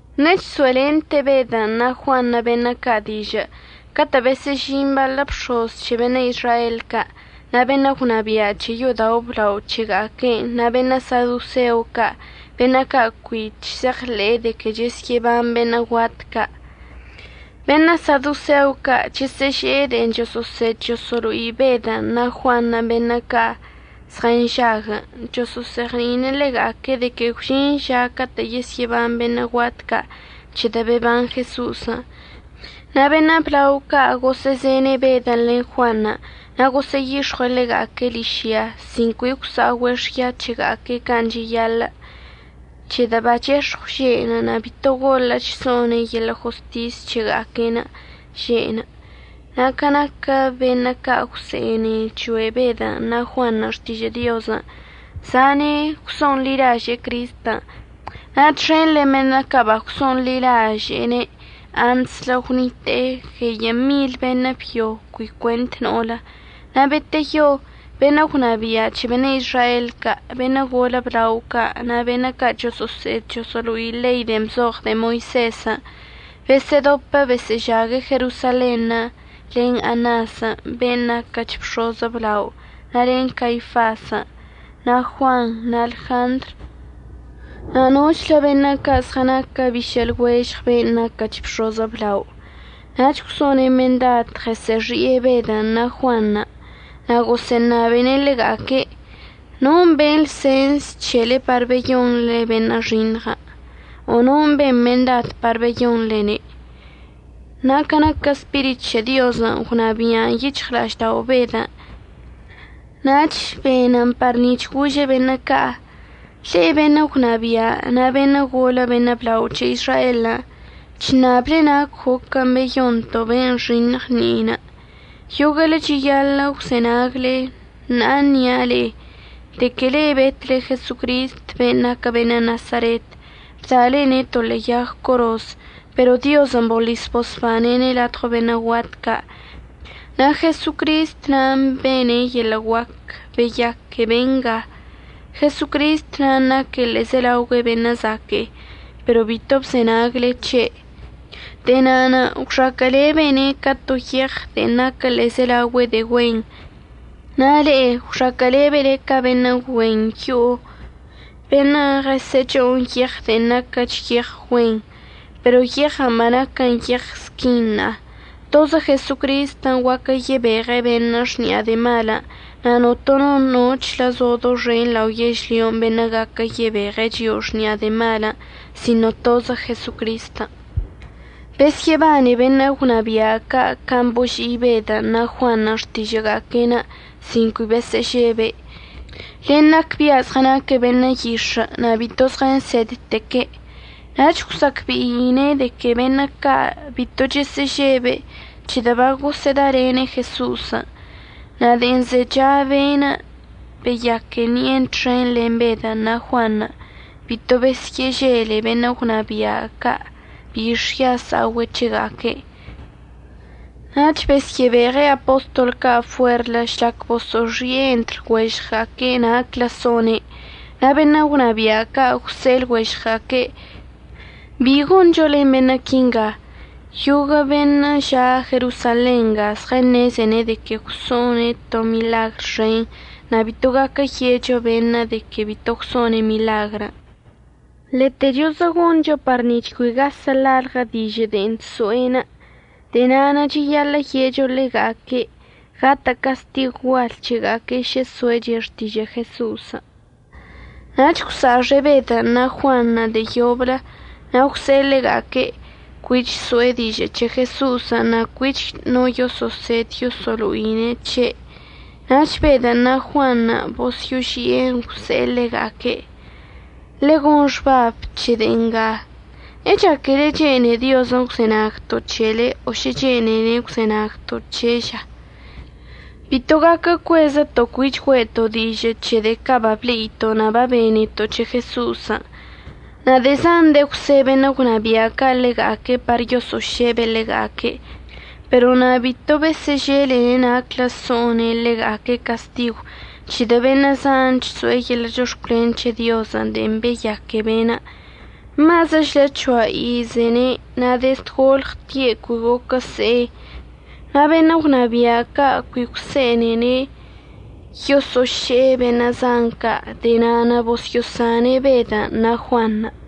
Ṉe'e chso'elente Bedən' na' Juanṉə' beṉə' ca' dižə' catə' besə'əžin baḻə bx̱oz c̱he beṉə' Izrael ca', na' beṉə' gwnabia' c̱he yo'odao' əblao c̱hega'aque'enə' na' beṉə' sadoseo ca' beṉə' ca' cui chse'eɉḻe'e de que yesyə'əban beṉə' guat ca'. Beṉə' sadoseo ca' chəsə'əže'e de'en choso'osed choso'olo'i Bedən' na' Juanṉə' beṉə' ca' zɉənžaguən', choso'ozeɉni'ine' ḻega'aque' de que gwžin ža catə' yesyə'əban beṉə' guat ca' c̱hedə' beban Jeso'osən'. Na' beṉə' blao ca' gosə'əzene' Bedən' len Juanṉə' na' gosə'əyix̱ɉue' ḻega'aque' ližyan' sin cui gwsa'ogüe' xya c̱hega'aque' can' cheyaḻə', c̱hedə' bachex̱ɉw že'enə' na' bito goḻə'əch so'one' yeḻə' jostis c̱hega'aque'enə' že'enə'. Na' ca naquə beṉə' ca' gwse'ene choe' Bedən' na' Juanṉə' xtižə' Diozən' zane' gwso'onḻilaže'e Cristən', na' txen len beṉə' ca' bagwso'onḻilaže'ene' antslə gwnitə' gueyə' mil beṉə' byo cui cuent no'olə. Na' beteyo beṉə' gwnabia' c̱he beṉə' Izrael ca', beṉə' golə blao ca' na' beṉə' ca' choso'osed choso'olo'i ḻei de'en bzoɉ de'e Moisezən' besə'ədopə besə'əžague' Jerosalenṉə' len Anasən' ben' naquəch bx̱oz əblao na' len Caifasən' na' Juanṉə' na' Ljandr na' nochlə beṉə' ca' zɉənaque' bišə' lɉuežɉ ben' naquəch bx̱oz əblaon'. Nach gwso'one' mendad ɉəsə'əxi'e Bedən' na' Juanṉə' na' gosə'əṉabene' ḻega'aque': ―¿Non' ben lsens c̱hele par beyonḻe be'enə' nxiṉɉən'? o ¿non' ben mendad par beyonḻene'? Na' ca naquə Spirit c̱he Diozən' gwnabia'an yic̱hɉla'aždao' Bedən' nach benən par nic̱h gože' beṉə' ca': ―Le'e beṉə' gwnabia' na' beṉə' golə beṉə' blao c̱he Izraelən', chṉable nac goquən' beyonto' be'enə' nxiṉɉ ṉi'enə'. Yoguə'əle cheyaḻə' gwzenagle na' ənia' le'e, de que le'e betle Jesocristən' be'enə' naquə beṉə' Nasaret, bda'alene' to ḻe'e yag coroz, pero Diozən' boḻis bosbane'ene' ladɉo beṉə' guat ca', na' Jesocrist nan' bene' yeḻə' guac beyaque benga. Jesocristən' naque' ḻe'ezelaogüe beṉə' zaque'e, pero bito bzenagle c̱he'. De'e na'anə' gwxaquə'əlebene' ca to yeɉ de'en naquə ḻe'ezelaogüe de'e güen na' le'e gwxaquə'əlebele ca beṉə' güen yo'o beṉə' ɉəsə'əc̱ho'on yeɉən' de'e naquəch yeɉ güen, pero yeɉən' banaquən yeɉ squin ṉa'a. Tozə Jesocristən' guaquə yebeɉe' beṉə' xni'a de'e malən', na' notono nochlə zo doxen lao yežlyon' beṉə' gaquə yebeɉ chio'o xni'a de'e malən' sino tozə Jesocristən'. Besyə'əbane beṉə' gwnabia' ca' can' boži'i Bedən' na' Juanṉə' xtižə'əga'aque'enə' sin cui besə'əžebe', len nacbia' zɉənaque' beṉə' yix̱ə' na' bito zɉənsedteque'. Nach gwsa'acbe'ine' de que beṉə' ca' bito chesə'əžebe' c̱hedə' bagosə'ədalene' Jeso'osən'. Na' de'en zecha ben' beyaque ṉi'enə' txen len Bedən' na' Juanṉə' bito besyə'əžele beṉə' gwnabia' ca' bi xya sa'ogüe' c̱hega'aque'. Nach besyə'əbeɉe' apostol ca' fuerlə žlac boso'oxi'e entr lɉuežɉga'aque' naclə so'one'. Na' beṉə' gwnabia' ca' gwse'e lɉuežɉga'aque': ―¿Bi goncho len beṉə' quinga? Yoguə' beṉə' ža' Jerosalen nga zɉəṉezene' de que gwso'one' to miḻagr xen na' bito gaquə ye'echo beṉə' de que bito gwso'one' miḻagrən'. Ḻetechozə goncho par nic̱h cui gasə' lalɉə dižə' de'en chso'enə'. De'e na'anə' cheyaḻə' ye'echo ḻega'aque' gatə' castigw gual c̱hega'aque' šə so'eche' xtižə' Jeso'osən'. Nach gwsa'axe' Bedən' na' Juanṉə' de'e yoblə na' gwse'e ḻega'aque' cuich so'e dižə' c̱he Jeso'osən' na' cuich no yoso'osed yoso'olo'ine' c̱he'. Nach Bedən' na' Juanṉə' bosyo'oži'en gwse'e ḻega'aque': ―Ḻegon xbab c̱he de'e nga, ¿əchaquele chene'e Diozən' gwzenagto' c̱hele o šə chene'ene' gwzenagto' c̱he'enə' ža? Bito gaquə cuezəto' cuich güe'eto' dižə' c̱he de'e ca' bable'ito' na' babeneto' c̱he Jeso'osən'. Na' de'e zan de'e gwse' beṉə' gwnabia' ca' ḻega'aque' par yoso'ošebe' ḻega'aque'. Pero na' bito besə'əželene' naclə so'one' ḻega'aque' castigw c̱hedə' beṉə' zan chso'e yeḻə' chox̱cwlen c̱he Diozən' de'en beyaque be'enə'. Mazəchlə c̱hoa izene' na' dezd golɉtie' cui goquə se'e. Na' beṉə' gwnabia' ca' cui gwse'enene' yoso'oše'e beṉə' zan ca', de'e na'anə' bosyo'osane' Bedən' na' Juanṉə'.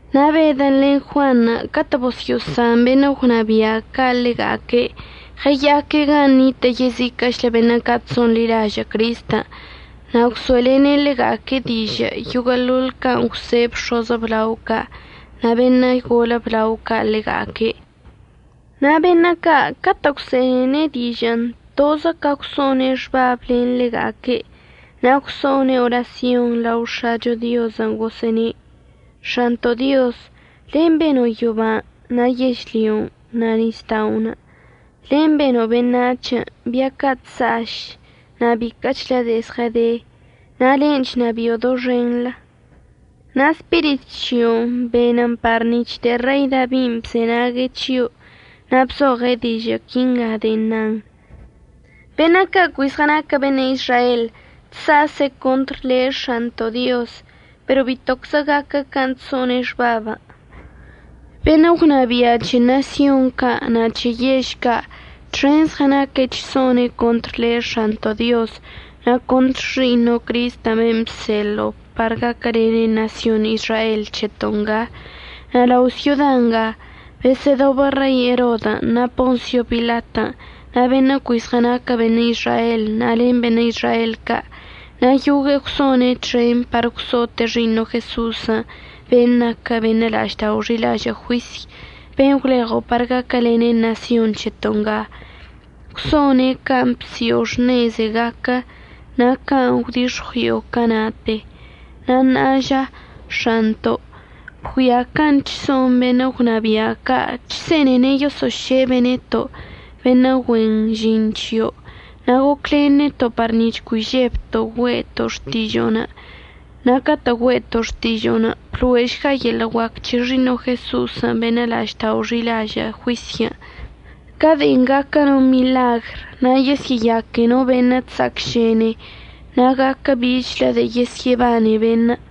Na' Bedən' len Juanṉə' catə' bosyo'osan beṉə' gwnabia' ca' ḻega'aque' ɉəya'aque' gan' nitə' yeziquə'əchlə beṉə' ca' chso'onḻilažə' Cristən' na' gwso'elene' ḻega'aque' dižə' yoguə'əḻoḻ can' əgwse' bx̱oz əblao ca' na' beṉə' golə blao ca' ḻega'aque'. Na' beṉə' ca' catə' gwse'enene' dižə'ən tozə can' gwso'one' xbab len ḻega'aque' na' gwso'one' orasyonṉə' lao X̱acho Diozən' gosə'əne': ―X̱anto' Dioz, len' beno' yoban' na' yežlyon' na' nisda'onə'. Len' beno' beṉac̱h, bia ca' chsa'aš na' biquə'əchlə de'e zɉəde, na' len' chnabi'o doxenḻə. Na' Spirit c̱hio'onə' benən par nic̱h de'e Rei Dabin' bzenague' c̱hio' na' bzoɉe' dižə' quinga de'en nan: Beṉə' ca' cui zɉənaquə beṉə' Izrael chsa'ase' contr le' X̱anto' Dioz, pero bitoczə gaquə can' chso'one' xbabən'. Beṉə' gwnabia' c̱he ṉasyon ca' na' c̱he yež ca' txenṉə' zɉənaque' chso'one' contr le' X̱anto' Dioz, na' contr Xi'iṉo' Cristən' ben' bseḻo'o par gaquəlene' ṉasyon Izrael c̱heto' nga. Na' lao' syoda ngan' besə'ədobə Rei Erodən' na' Ponsio Pilatən' na' beṉə' cui zɉənaque' beṉə' Izrael, na' len beṉə' Izrael ca'. Na' yogue'e gwso'one' txen par gwso'ote' Xi'iṉo' Jeso'osən' ben' naquə beṉə' la'aždao' xi'ilažə' juisy, ben' gwleɉo' par gaquəlene' ṉasyon c̱heto' nga. Gwso'one' can' bsi'o xṉeze gaquə na' can' gwdix̱ɉui'o cana'ate. Na' ṉa'a ža X̱anto', bgüia can' chso'on beṉə' gwnabia' ca' chse'enene' yoso'ošebe' neto' beṉə' güen žin c̱hio', na' goclen neto' par nic̱h cui žebto' güe'eto' xtižo'onə'. Na' catə' güe'eto' xtižo'onə' blo'ešga yeḻə' guac c̱he Xi'iṉo' Jeso'osən' beṉə' la'aždao' xi'ilažə' juisyən' ca de'en gaquə no miḻagr, na' yesyə'əyaque no beṉə' chsa'acšene na' gaquə bichlə de'e yesyə'əbane beṉə'.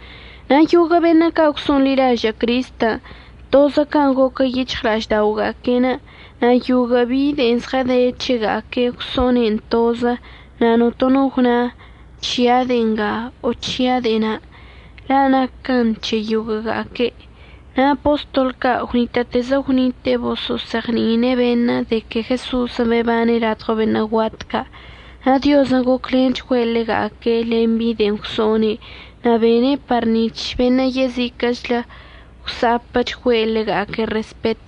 Na' yoguə' beṉə' ca' gwso'onḻilažə' Cristən' tozə can' goquə yic̱hɉla'ažda'oga'aque'enə'. Na' yoguə' bi de'en zɉəde c̱hega'aque'enə' gwso'one'en tozə na' notono gwna: “C̱hia' de'e nga”, o “C̱hia' de'e na'”, la' naquən c̱he yoguə'əga'aque'. Na' apostol ca' gwnitə'ətezə gwnite'e boso'ozeɉni'ine' beṉə' de que Jeso'osən' bebane' ladɉo beṉə' guat ca'. Na' Diozən' goclenchgüe' ḻega'aque' len bi de'en gwso'one' na' bene' par nic̱h beṉə' yeziquə'əchlə gwsa'apəchgüe' ḻega'aque' respet.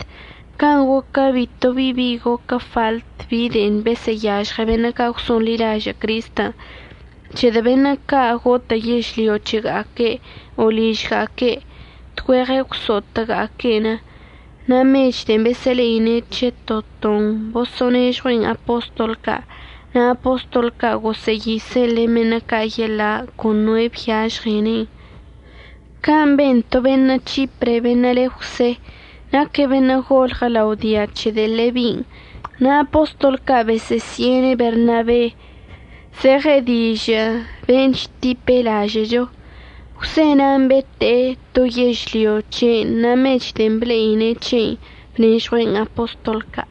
Can' goquə bito bi bi goquə faḻt bi de'en besə'əyažɉe beṉə' ca' gwso'onḻilažə' Cristən', c̱hedə' beṉə' ca' gotə' yežlyo c̱hega'aque' o ližga'aque' tgüeɉə gwso'otəga'aque'en. Na' mech de'en besə'əle'ine' c̱he to ton boso'onežɉue'en apostol ca' na' apostol ca' gosə'əyise'en len beṉə' ca' yeḻa' con noe' byažɉene'en. Can' ben to beṉə' C̱hipre beṉə' le Jwse. Naque' beṉə' golɉə lao dia c̱he de'e Lebin' na' apostol ca' bosə'əsi'ene' Bernabe, zeɉen dižə' ben' chtipe' lažə'əcho. Jwse na'anə' bete'e to yežlyo c̱he'enə' na' mech de'en ble'ine' c̱heinə' bnežɉue'en apostol ca'.